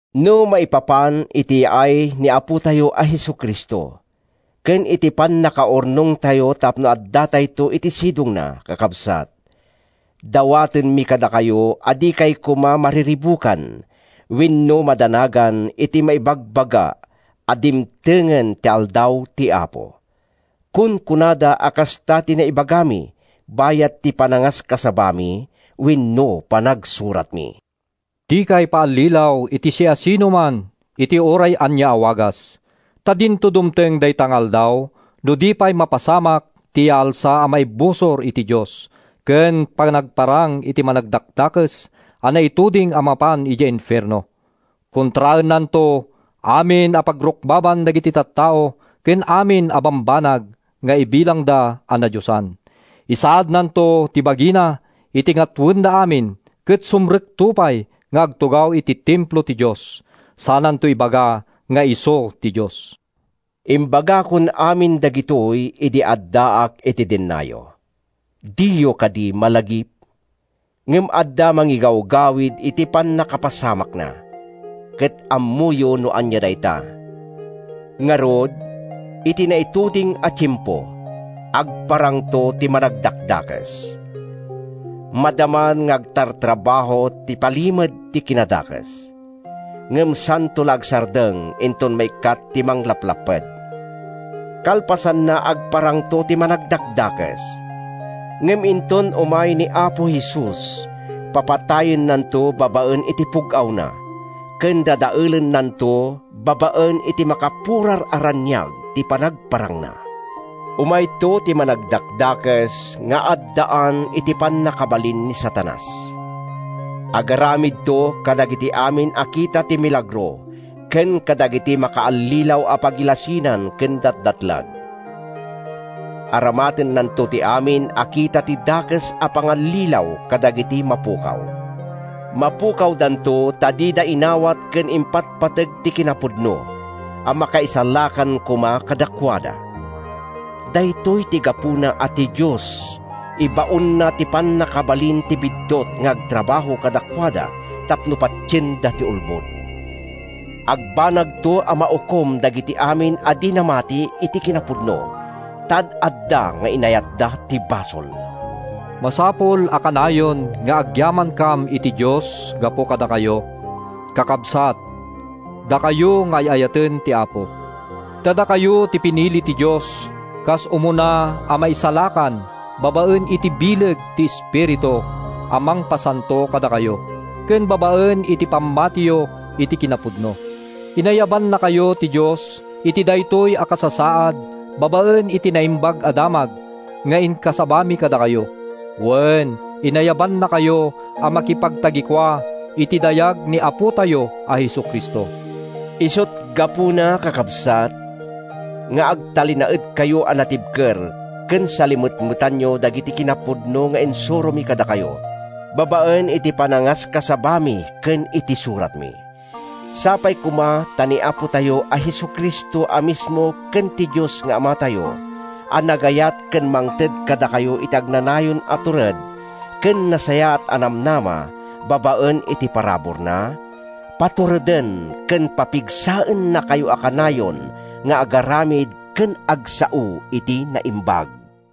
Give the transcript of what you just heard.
No maipapan iti yaay ni Apotayo a Jesu-Cristo ken iti pannakaurnongtayo tapno addatayto iti sidongna, kakabsat, dawatenmi kadakayo a dikay koma mariribukan wenno madanagan iti maibagbaga a dimtengen ti Aldaw ti Apo. Kunkunada a kasta ti naibagami bayat ti panangaskasabami wenno panagsuratmi. Dikay paallilaw iti siasino man iti uray ania a wagas. Ta dinto dumteng dayta nga Aldaw no di mapasamak ti Yaalsa a maibusor iti Dios ken panagparang ti Managdakdakes a naituding a mapan idiay infierno. Kontraennanto amin a pagrukbaban dagiti tattao ken amin a bambanag nga ibilangda a nadiosan. Isaadnanto ti bagina iti ngatoenda amin ket sumrekto pay nga agtugaw iti Templo ti Dios, sananto ibaga nga isu ti Dios. Imbagakon amin dagitoy idi addaak iti dennayo. Diyo kadi malagip? Ngem adda mangigawgawid iti pannakapasamakna, ket ammoyo no ania dayta. Ngarud, iti naituding a tiempo, agparangto ti Managdakdakes. Madaman nga agtartrabaho ti Palimed ti Kinadakes, ngem santo la agsardeng inton maikkat ti manglaplapped. Kalpasanna, agparangto ti Managdakdakes, ngem inton umay ti Apo Jesus papatayennanto babaen iti pug-awna ken dadaelennanto babaen iti makapurar a raniag ti panagparangna. Umayto ti Managdakdakes nga addaan iti pannakabalin ni Satanas. Agaramidto kadagiti amin a kita ti milagro ken kadagiti makaallilaw a pagilasinan ken datdatlag. Aramatennanto ti amin a kita ti dakes a pangallilaw kadagiti mapukaw. Mapukawdanto ta dida inawat ken impatpateg ti kinapudno a makaisalakan koma kadakuada. Daytoy ti gapuna a ti Dios ibaonna ti pannakabalin ti biddut nga agtrabaho kadakuada tapno patienda ti ulbod. Agbanagto a maukom dagiti amin a di namati iti kinapudno, ta ad-adda nga inayatda ti basol. Masapul a kanayon nga agyamankam iti Dios gapu kadakayo, kakabsat, dakayo nga ay-ayaten ti Apo. Ta dakayo ti pinili ti Dios kas umuna a maisalakan babaen iti bileg ti Espiritu a mangpasanto kadakayo ken babaen iti pammatiyo iti kinapudno. Inayabannakayo ti Dios iti daytoy a kasasaad babaen iti Naimbag a Damag nga inkasabami kadakayo. Wen, inayabannakayo a makipagtagikua iti dayag ni Apotayo a Jesu-Cristo. Isut’ gapuna, kakabsat, nga agtalinaedkayo a natibker ket salimetmetanyo dagiti kinapudno nga insuromi kadakayo babaen iti panangaskasabami ken iti suratmi. Sapay koma ta ni Apotayo a Jesu-Cristo a mismo ken ti Dios nga Amatayo, a nagayat ken mangted kadatayo iti agnanayon a tured ken nasayaat a namnama babaen iti paraburna, patureden ken papigsaennakayo a kanayon nga agaramid ken agsao iti naimbag.